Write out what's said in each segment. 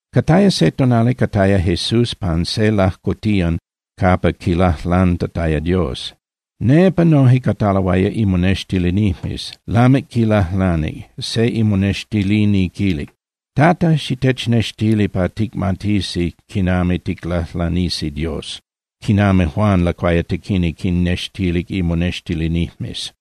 Cataya se tonali cataya Jesús pan se lajcotiyan capa quilajlantataya Dios. Nepa noje cataloaya imonextilinijmes. Lamic quilajlanic, se imonextilini quilic: —Tata, xitechnextili pa ticmatisi quinami ticlajlanisi Dios, quinami Juan Lacuayatequini quinnextilic imonextilinijmes.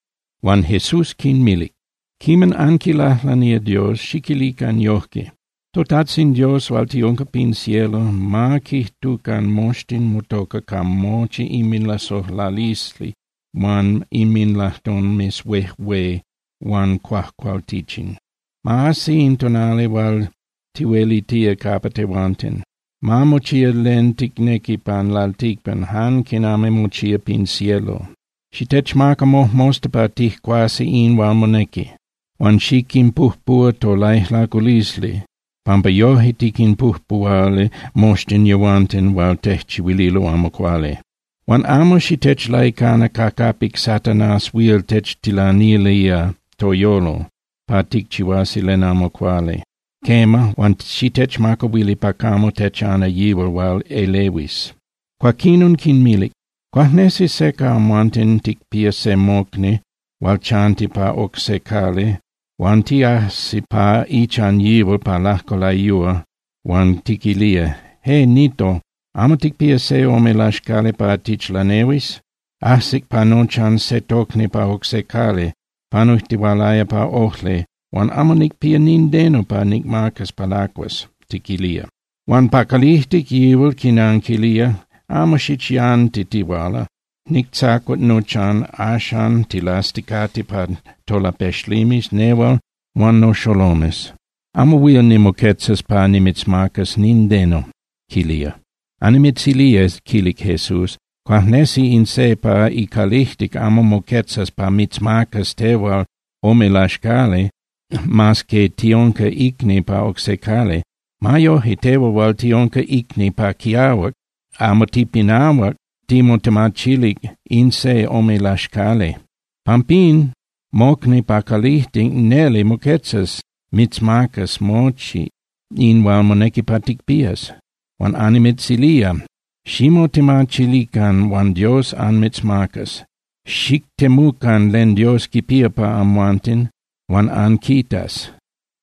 Huan Jesús quinmilic: —Quiman anquilajlanía Dios, xiquilican yoje: ToTajtzin Dios hual tiunca pin cielo, ma quijtucan moxtin motoca ca mochi inminlasojlalisli huan inminlajtomes huejué huan cuajcualtichin. Ma ajsi in tonali hual tihuelitía capa tehuanten. Ma mochía len ticnequi pan lalticpan jan quinami mochía pin cielo. Xitechmaca mojmosta pa tijcuasi in hual monequi. Huan xiquinpujpuhua tolaijlaculisli, pampa yoje tiquinpujpuhualo moxtin yehuanten hual tejchihuililo amo cuali. Huan amo xitechlaicana ca capic Satanás huil techtilanilía toyolo pa ticchihuasi len amo cuali, quema, huan xitechmacahuili pa camo techana yihual hual elehuis. Cuaquinon quinmilic: —Cuajnesi se ca amhuanten ticpía se mocni hual chanti pa oc se cali huan tiajsi pa ichan yihual pa lajco layúa huan tiquilía: “Eh, Nito, ¿amo ticpía se ome laxcali pa tichlanehuis? Ajsic pa nochan se tocni pa oc se cali panujtihualaya pa ojli, huan amo nicpía nindeno pa nicmacas pa lacuas” tiquilía. Huan pa calijtic yihual quinanquilía: “Amo xichyantitihuala. Nictzacuac nochan, axan tilasticate pa tolapexlimes nehual huan noxolomes. Amo huil nimoquetzas pa nimitzmacas nindeno” quilía. Annimitzilía —quilic Jesús—, cuajnesi in se pa icalijtic amo moquetzas pa mitzmacas tehual ome laxcali mas que tiunca icni pa oc se cali. Ma yoje, tehual hual tiunca icni pa quiahuac amo tipinahuac timotemachilic in se ome laxcali. Pampín, mocni pa calijtic neli moquetzas mitzmacas mochi in hual monequi pa ticpías. Huan annimitzilía: Ximotemachilican, huan Dios anmitzmacas. Xictemucan len Dios quipía pa amhuanten, huan anquitas.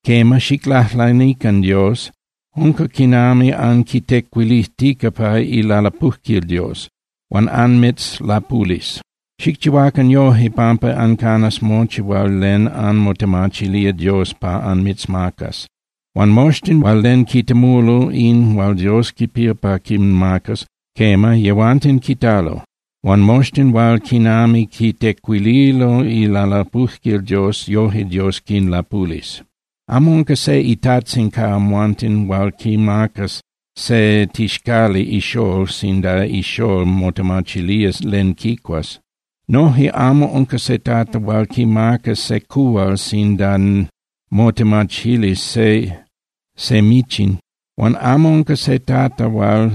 Quema, xiclajlanican Dios, unca quinami anquitecuilijtica pa ilalapujquil Dios. Huan anmitzlapulis. Xicchihuacan yoje pampa ancanas mochi hual len anmotemachilía Dios pa anmitzmacas. Huan moxtin hual len quitemulo in hual Dios quipía pa quinmacas, quema, yehuanten quitalo. Huan moxtin hual quinami quitecuililo ilalapujquil Dios, yoje Dios quinlapulis. ’Amo unca se itajtzin ca amhuanten hual quimacas se tixcali ixól sinda ixól motemachilía len quicuas. Noje amo unca se tata hual quimacas se cuhual sinda motemachilis se michin. Huan amo unca se tata hual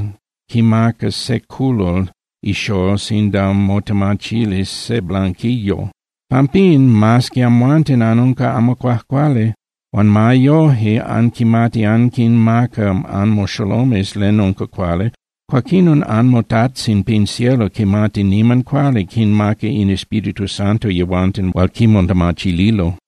quimacas se culol ixól sinda motemachilis se blanquillo. Pampín, mas que amhuanten anunca amo cuajcuali huan ma yoje anquimati anquinmaca anmoxolomes len unca cuali, cuaquinon anmoTajtzin pin cielo quimati niman cuali quinmaca in Espíritu Santo yehuanten hual quimotemachililo.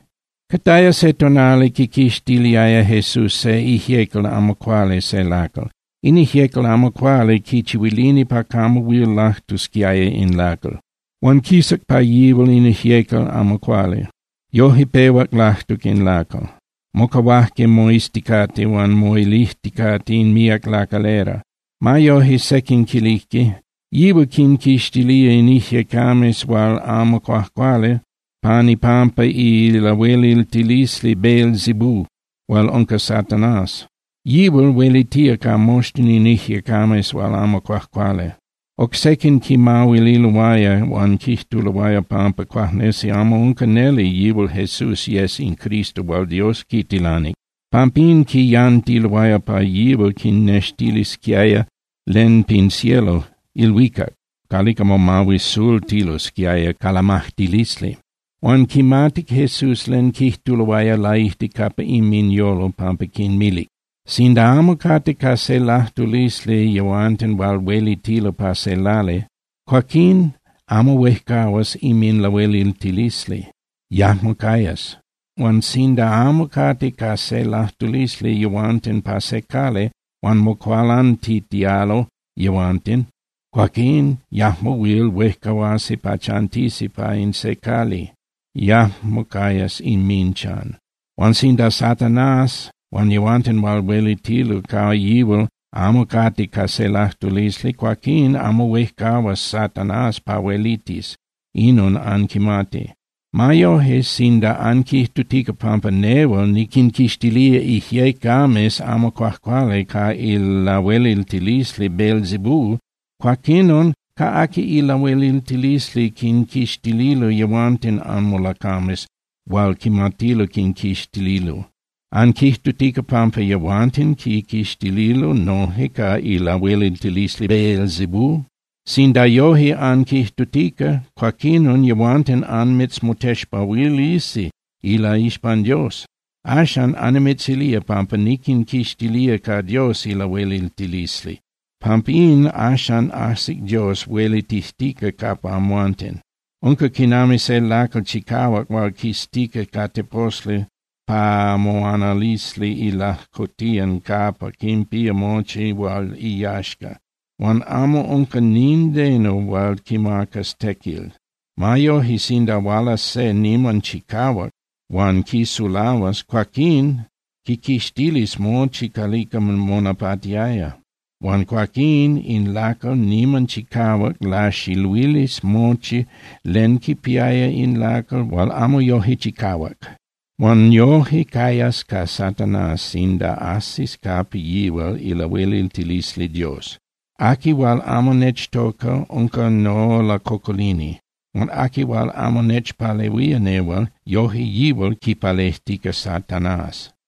Cataya se tonali quiquixtiliaya Jesús se ijyecal amo cuali se lacal. In ijyecal amo cuali quichihuilini pa camo huil lajtusquiaya in lacal. Huan quisac pa yihual in ijyecal amo cuali, yoje pehuac lajtuc in lacal. Mocahuajque moizticate huan moilijticate in míac lacalera. Ma yoje, sequin quilijque: —Yihual quinquixtilía in ijyecames hual amo cuajcuali pan ipampa ilahueliltilisli Beelzebú hual unca Satanás. Yihual huelitía ca moxtin in ijyecames hual amo cuajcuali. Oc sequin quimahuililoaya huan quijtuloaya pampa cuajnesi amo unca neli yihual Jesús yes in Cristo hual Dios quitilanic. Pampín quiyantiloaya pa yihual quinnextilisquiaya len pin cielo (ilhuicac) calica momahuisultilosquiaya ca lamajtilisli. Huan quimatic Jesús len quijtuloaya laijtic capa inminyolo, pampín quinmilic: —Sinda amo cate ca se lajtulisli yehuanten hual huelitilo pa se lali, cuaquín amo huejcahuas inminlahueliltilisli, yajmo cayas. Huan sinda amo cate ca se lajtulisli yehuanten pa se cali huan mocualantitialo yehuanten, cuaquín yajmo huil huejcahuasi pa chantisi pa in se cali, yajmo cayas inminchan. Huan sinda Satanás huan yehuanten hual huelitilo ca yihual amo cate ca se lajtulisli, cuaquín amo huejcahuas Satanás pa huelitis. Inon anquimati. Ma yoje, sinda anquijtutica pampa nehual niquinquixtilía ijyecames amo cuajcuali ca ilahueliltilisli Beelzebú, cuaquinon ¿ca aqui ilahueliltilisli quinquixtililo yehuanten anmolacames hual quimatilo quinquixtililo? ¿Anquijtutica pampa yehuanten quinquixtililo noje ca ilahueliltilisli Beelzebú? Sinda yoje anquijtutica, cuaquinon yehuanten anmitzmotexpahuilisi ilaixpan Dios. Axan annimitzilía pampa niquinquixtilía ca Dios ilahueliltilisli. Pampín, axan ajsic Dios huelitijtica capa amhuanten. Unca quinami se lacal chicahuac hual quiztica ca teposli pa moanalisli ilajcotiyan capa quinpía mochi hual iyaxca, huan amo unca nindeno hual quimacas tequil. Ma yoje, sinda hualas se niman chicahuac huan quisulahuas, cuaquín quiquixtilis mochi calica monapatiaya, huan cuaquín in lacal niman chicahuac laxiluilis mochi len quinpiaya in lacal hual amo yoje chicahuac. Huan yoje cayas ca Satanás sinda ajsis capa yihual ilahueliltilisli Dios. Aqui hual amo nechtoca unca nolacocolini. Huan aqui hual amo nechpalehuía nehual, yoje yihual quipalejtica Satanás.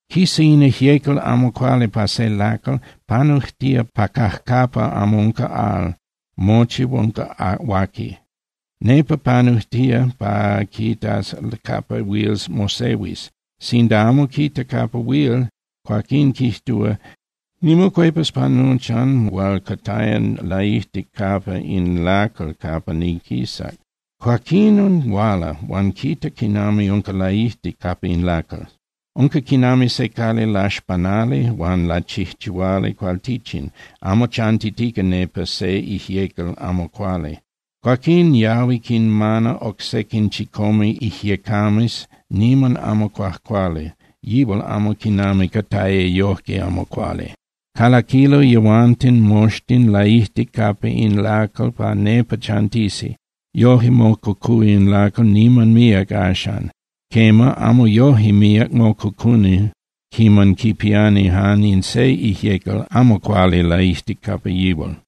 Quisa in ijyecal amo cuali pa se lacal, panujtía pa cajcapa amo unca al, mochi unca huaqui. Nepa panujtía pa quitas capa huil mosehuis. Sinda amo quita capa huil, cuaquín quijtúa: “Nimocuepas pa nochan hual cataya laijtic capa in lacal capa niquisac.” Cuaquinon huala, huan quita quinami unca laijtic capa in lacal. Unca quinami se cali laxpanali huan lachijchihuali cualtichin, amo chantitica nepa se ijyecal amo cuali. Cuaquín yahui quinmana oc sequin chicome ijyecames niman amo cuajcuali, yihual amo quiman cataya yojque amo cuali. Calaquilo yehuanten moxtin laijtic capa in lacal pa nepa chantisi. Yoje mococúa in lacal niman míac axan. Quema, amo yoje míac mococuni quiman quipiani jan in se ijyecal amo cuali laijtic capa yihual.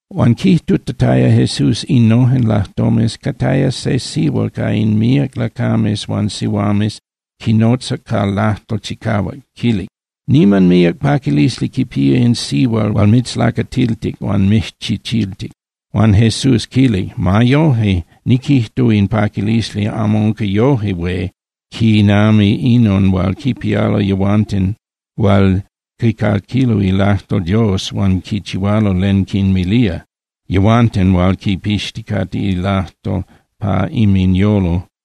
Huan quijtutataya Jesús innojen lajtomes, cataya se sihual ca in míac lacames huan sihuames, quinotzac ca lajtol chicahuac, quilic: —¡Niman míac paquilisli quipía in sihual hual mitzlacatiltic huan mijchichiltic! Huan Jesús quilic: —Ma yoje, niquijtúa in paquilisli amo unca yoje hué quinami inon hual quipialo yehuanten hual quicaquilo ilajtol Dios huan quichihualo len quinmilía, yehuanten hual quipixticate ilajtol pa inminyolo.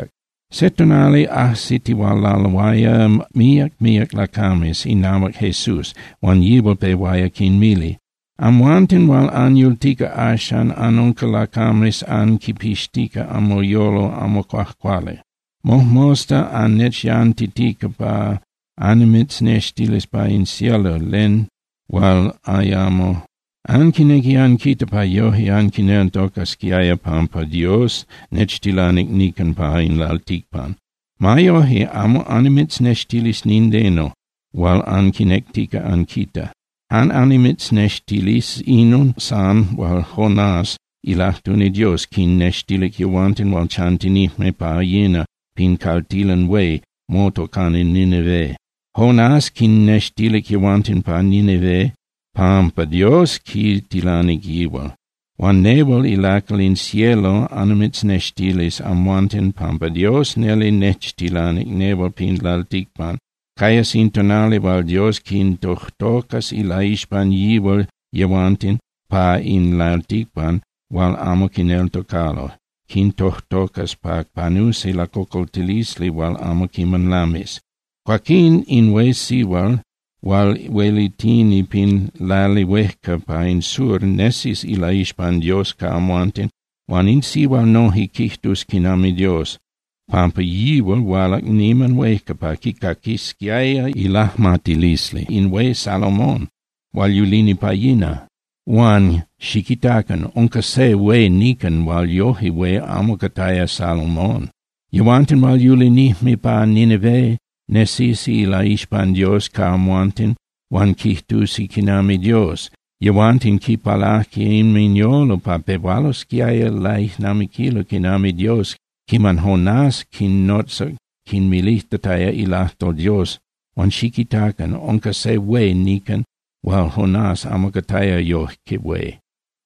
Se tonali ajsitihualaloaya míac míac lacames inahuac Jesús, huan yihual pehuaya quinmili: —Amhuanten hual anyultica axan anunca lacames anquipixtica anmoyolo amo cuajcuali. Mojmosta annechyantitica pa annimitznextilis pa in cielo len hual ayamo quiman anquitaya. Anquinequi anquita pa yoje anquineltocasquiaya pampa Dios nechtilanic nican pa in lalticpan. Ma yoje, amo annimitznextilis nindeno hual anquinectica anquita. Jan annimitznextilis inon san hual Jonás ilajtuni Dios quinnextilic yehuanten hual chantinijme pa yina pin caltilan hué motocani Nínive. Jonás quinnextilic yehuanten pa Nínive pampa Dios quitilanic yihual. Huan nehual ilacal in cielo annimitznextilis amhuanten pampa Dios neli nechtilanic nehual pin lalticpan. Cayas in tonali hual Dios quintojtocas ilaixpan yihual yehuanten pa in lalticpan hual amo quineltocalo, quintojtocas pa panusi lacocoltilisli hual amo quiman lamis. Cuaquín in hué sihual hual huelitini pin lali huejca pa in sur nesis ilaixpan Dios ca amhuanten. Huan in sihual noje quijtus quinami Dios, pampa yihual hualac niman huejca pa quicaquisquiaya ilajmatilisli in hué Salomón hual yulini pa yina. Huan xiquitacan. Unca se hué nican hual yoje hué amo cataya Salomón. Yehuanten hual yulinijme pa Nínive nesisi ilaixpan Dios ca amhuanten huan quijtusi quinami Dios. Yehuanten quipalaje inminyolo pa pehualosquiaya laijnamiquilo quinami Dios quiman Jonás quinnotzac quinmilijtataya ilajtol Dios. Huan xiquitacan. Unca se hué nican hual Jonás amo cataya yoje hué.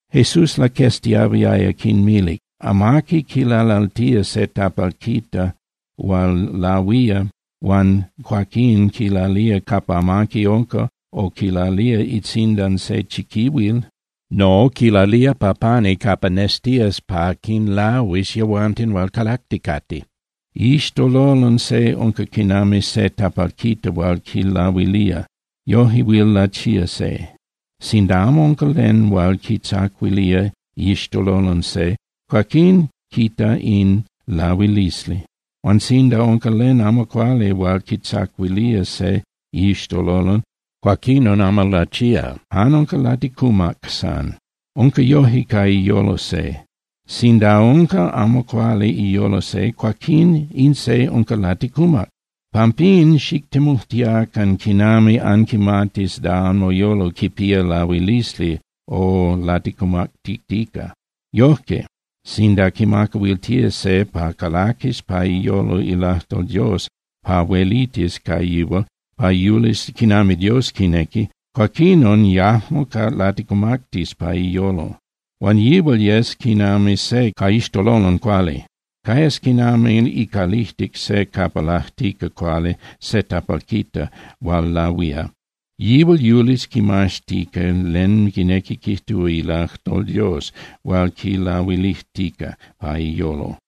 Jesús laqueztiahuiaya, quinmilic: —Amaqui quilalaltía se tapalquita hual lahuía huan cuaquín quilalía capa amaqui unca o quilalía itzindan se chiquihuil. No, quilalía pa pani capa nestías pa quinlahuis yehuanten hual calacticate. Iixtololon se unca quinami se tapalquita hual quilahuilía, yoje huil lachía se. Sinda amo unca len hual quitzacuilía iixtololon se, cuaquinon quita in lahuilisli. Huan sinda unca len amo cuali hual quitzacuilía se iixtololon, cuaquinon amo lachía, jan unca laticumac san. Unca yoje ca iyolo se. Sinda unca amo cuali iyolo se, cuaquín in se unca laticumac. Pampín xictemujtiacan quinami anquimatis da anmoyolo quipía lahuilisli o laticumactitica. Yojque, sinda quimacahuiltía se pa calaquis pa iyolo ilajtol Dios pa huelitis ca yihual pa yulis quinami Dios quinequi, cuaquinon yajmo laticumactis pa iyolo. Huan yihual yes quinami se ca iixtololon cuali. Cayas quinami icalijtic se capa lajtica cuali se tapalquita hual lahuía. Yihual yulis quimaztica len quinequi quijtúa ilajtol Dios hual quilahuilijtica pa iyolo.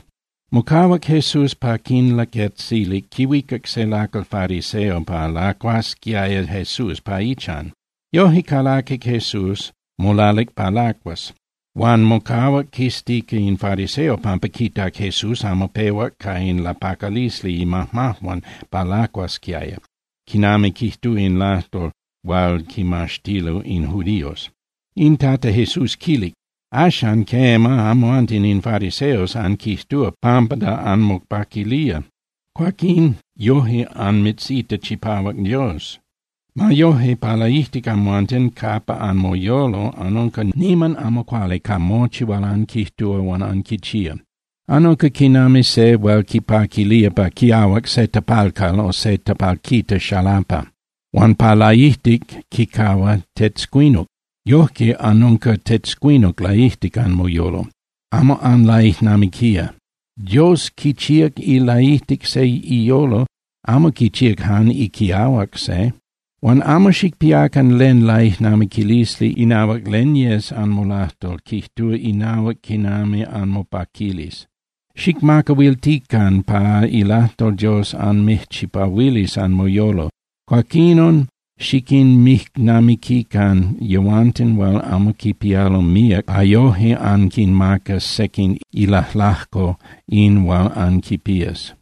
Mocahuac Jesús pa quinlaquetzilic, quihuicac se lacal fariseo pa lacuasquiaya Jesús pa ichan. Yoje calaquic Jesús, molalic pa lacuas. Huan mocahuac quiztica in fariseo pampa quitac Jesús amo pehuac ca in lapacalisli imajmajuan pa lacuasquiaya, quinami quijtúa in lajtol hual quimaxtilo in judíos. In Tata Jesús quilic: —Axan, quema, amhuanten in fariseos anquijtúa pampa da anmopaquilía, cuaquín yoje anmitzita chipahuac Dios. Ma yoje, pa laijtic amhuanten capa anmoyolo anunca niman amo cuali ca mochi hual anquijtúa huan anquichía. Anunca quinami se hual quipaquilía pa quiahuac se tapalcal o se tapalquita xalapa, huan pa laijtic quicahua tetzcuinuc. Yoje anunca tetzcuinuc laijtic anmoyolo. ¡Amo anlaijnamiquía! Dios quichíac ilaijtic se iyolo, amo quichíac jan iquiahuac se. Huan amo xicpiacan len laijnamiquilisli inahuac len yes anmolajtol quijtúa inahuac quinami anmopaquilis. Xicmacahuiltican pa ilajtol Dios anmijchipahuilis anmoyolo, cuaquinon xiquinmijnamiquican yehuanten hual amo quipialo míac pa yoje anquinmacas sequin ilajlajco in hual anquipías.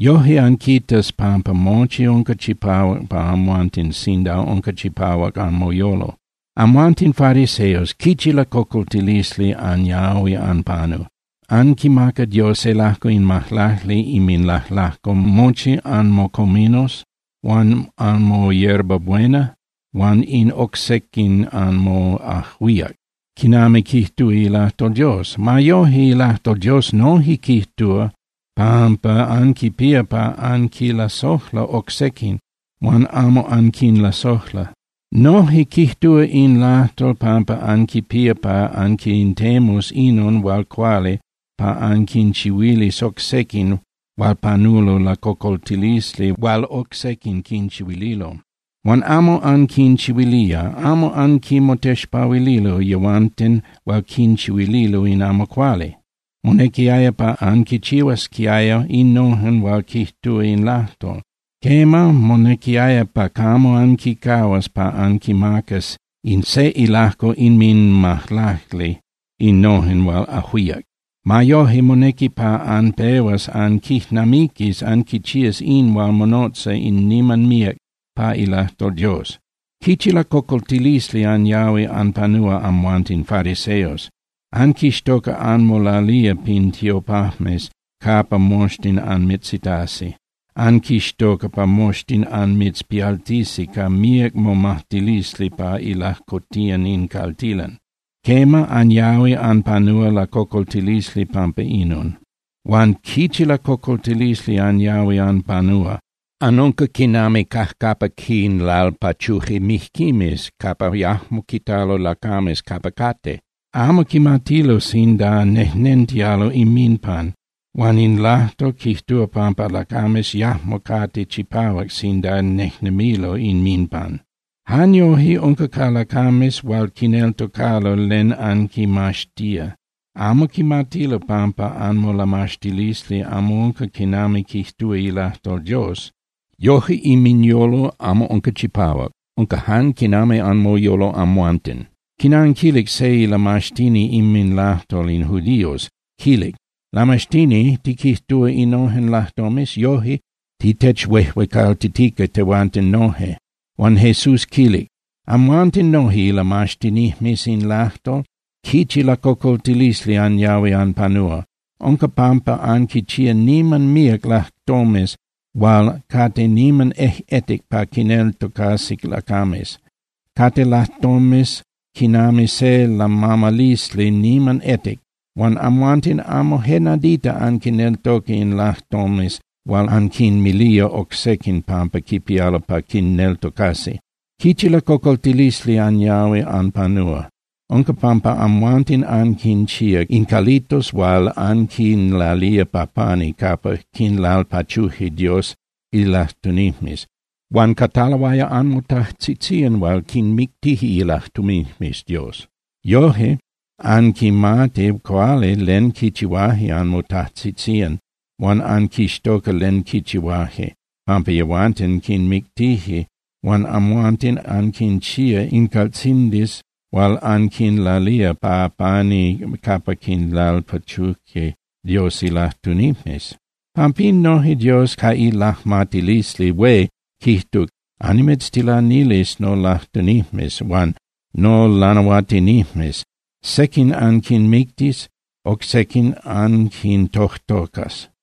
Yoje anquitas pampa mochi unca chipahuac pa amhuanten sinda unca chipahuac anmoyolo. Amhuanten fariseos, ¡quichi lacocoltilisli anyahui anpanu! Anquimaca Dios se ilajco in majlacli inminlajlajco mochi anmocominos huan anmoyerbabuena huan in oc sequin anmoajuíac, quinami quijtúa ilajtol Dios. Ma yoje, ilajtol Dios noje quijtúa pampa anquipía pa anquilasojla oc sequin, huan amo anquinlasojla. Noje quijtúa in lajtol pampa anquipía pa anquintemus inon hual cuali pa anquinchihuilis oc sequin hual panulo lacocoltilisli hual oc sequin quinchihuililo. Huan amo anquinchihuilía, amo anquinmotexpahuililo yehuanten hual quinchihuililo in amo cuali. Monequiaya pa anquichihuasquiaya innojen hual quijtúa in lajtol. Quema, monequiaya pa camo anquicahuas pa anquimacas in se ilajco inminmajlacli innojen hual ajuíac. Ma yoje, monequi pa anpehuas anquijnamiquis anquichías in hual monotza in niman míac pa ilajtol Dios. ¡Quichi lacocoltilisli anyahui anpanúa amhuanten fariseos! Anquixtoca anmolalía pin tiopajmes capa moxtin anmitzitasi. Anquixtoca pa moxtin anmitzpialtisi ca míac momajtilisli pa ilajcotiyan in caltilan. Quema, anyahui anpanúa lacocoltilisli pampa inon. Huan ¡quichi lacocoltilisli anyahui anpanúa! Anunca quinami cajcapa quinlalpachuje mijquimes, capa yajmo quitalo lacames capa cate. Amo quimatilo sinda nejnentialo inminpan, huan in lajtol quijtúa pampa lacames yajmo cate chipahuac sinda nejnemilo inminpan. Jan yoje unca ca lacames hual quineltocalo len anquimaxtía. Amo quimatilo pampa anmolamaxtilisli amo unca quinami quijtúa ilajtol Dios. Yoje inminyolo amo unca chipahuac, unca jan quinami anmoyolo amhuanten. Quinanquilic se ilamaxtini inminlajtol in judíos, quilic: —Lamaxtini, tiquijtúa innojen lajtomes, yoje titechuejuecaltitica tehuanten noje. Huan Jesús quilic: —Amhuanten noje ilamaxtinijmes in lajtol, ¡quichi lacocoltilisli anyahui anpanúa! Unca pampa anquinchía niman míac lajtomes hual cate niman ejꞌetic pa quinneltocasi lacames. Cate lajtomes quinami se lamamalisli niman etic, huan amhuanten amo je nadita anquinneltoca in lajtomes hual anquinmilía oc sequin pampa quipialo pa quinneltocasi. ¡Quichi lacocoltilisli anyahui anpanúa! Unca pampa amhuanten anquinchíac in calitos hual anquinlalía pa pani capa quinlalpachuje Dios ilajtunijmes. Huan cataloaya anmotajtzitzían hual quinmictije ilajtunijmes Dios. Yoje anquimati cuali len quichihuaje anmotajtzitzían, huan anquixtoca len quichihuaje, pampa yehuanten quinmictije huan amhuanten anquinchía in caltzindis hual anquinlalía pa pani capa quinlalpachuje Dios ilajtunijmes. Pampín noje Dios ca ilajmatilisli hué quijtuc: “Annimitztilanilis nolajtunijmes huan nolanahuatinijmes. Sequin anquinmictis, oc sequin anquintojtocas.”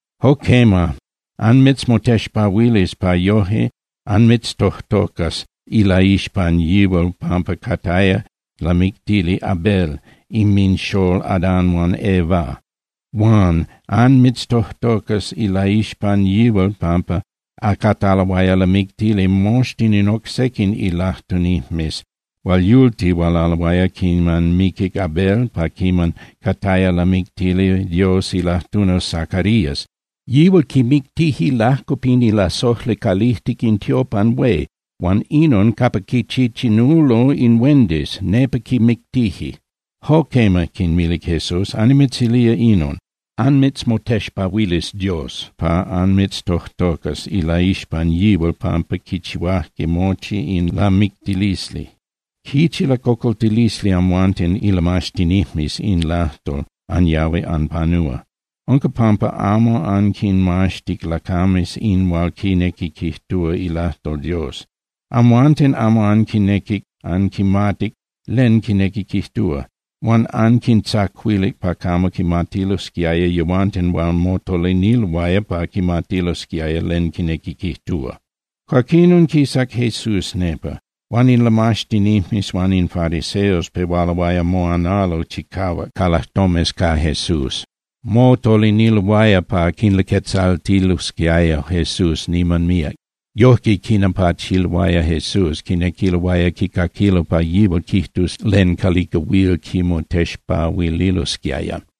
Jo quema, anmitzmotexpahuilis pa yoje anmitztojtocas ilaixpan yihual pampa cataya lamictili Abel inminxól Adán huan Eva. Huan anmitztojtocas ilaixpan yihual pampa cataloaya lamictili moxtin in oc sequin ilajtunijmes hual yultihualaloaya quiman miquic Abel, pa quiman cataya lamictili Dios ilajtuni Zacarías. Yihual quimictije lajco pin ilasojli calijtic in tiopan hué huan inon capa quichichinulo in huendis, nepa quimictije. Jo quema —quinmilic Jesús—, annimitzilía inon, anmitzmotexpahuilis Dios pa anmitztojtocas ilaixpan yihual pampa quichihuajque mochi in lamictilisli. ¡Quichi lacocoltilisli amhuanten ilamaxtinijmes in lajtol anyahui anpanúa! Unca pampa amo anquinmaxtic lacames in hual quinequi quijtúa ilajtol Dios. Amhuanten amo anquinequic anquimatic len quinequi quijtúa, huan anquintzacuilic pa camo quimatilosquiaya yehuanten hual motoliniloaya pa quimatilosquiaya len quinequi quijtúa. Cuaquinon, quisac Jesús nepa. Huan in lamaxtinijmes huan in fariseos pehualoaya moanalo chicahuac ca lajtomes ca Jesús. Motoliniloaya pa quilaquetzaltilosquiaya Jesús niman míac. Yojque quinapachiloaya Jesús, quinequiloaya quicaquilo pa yihual quijtus len calica huil quimotexpahuililosquiaya.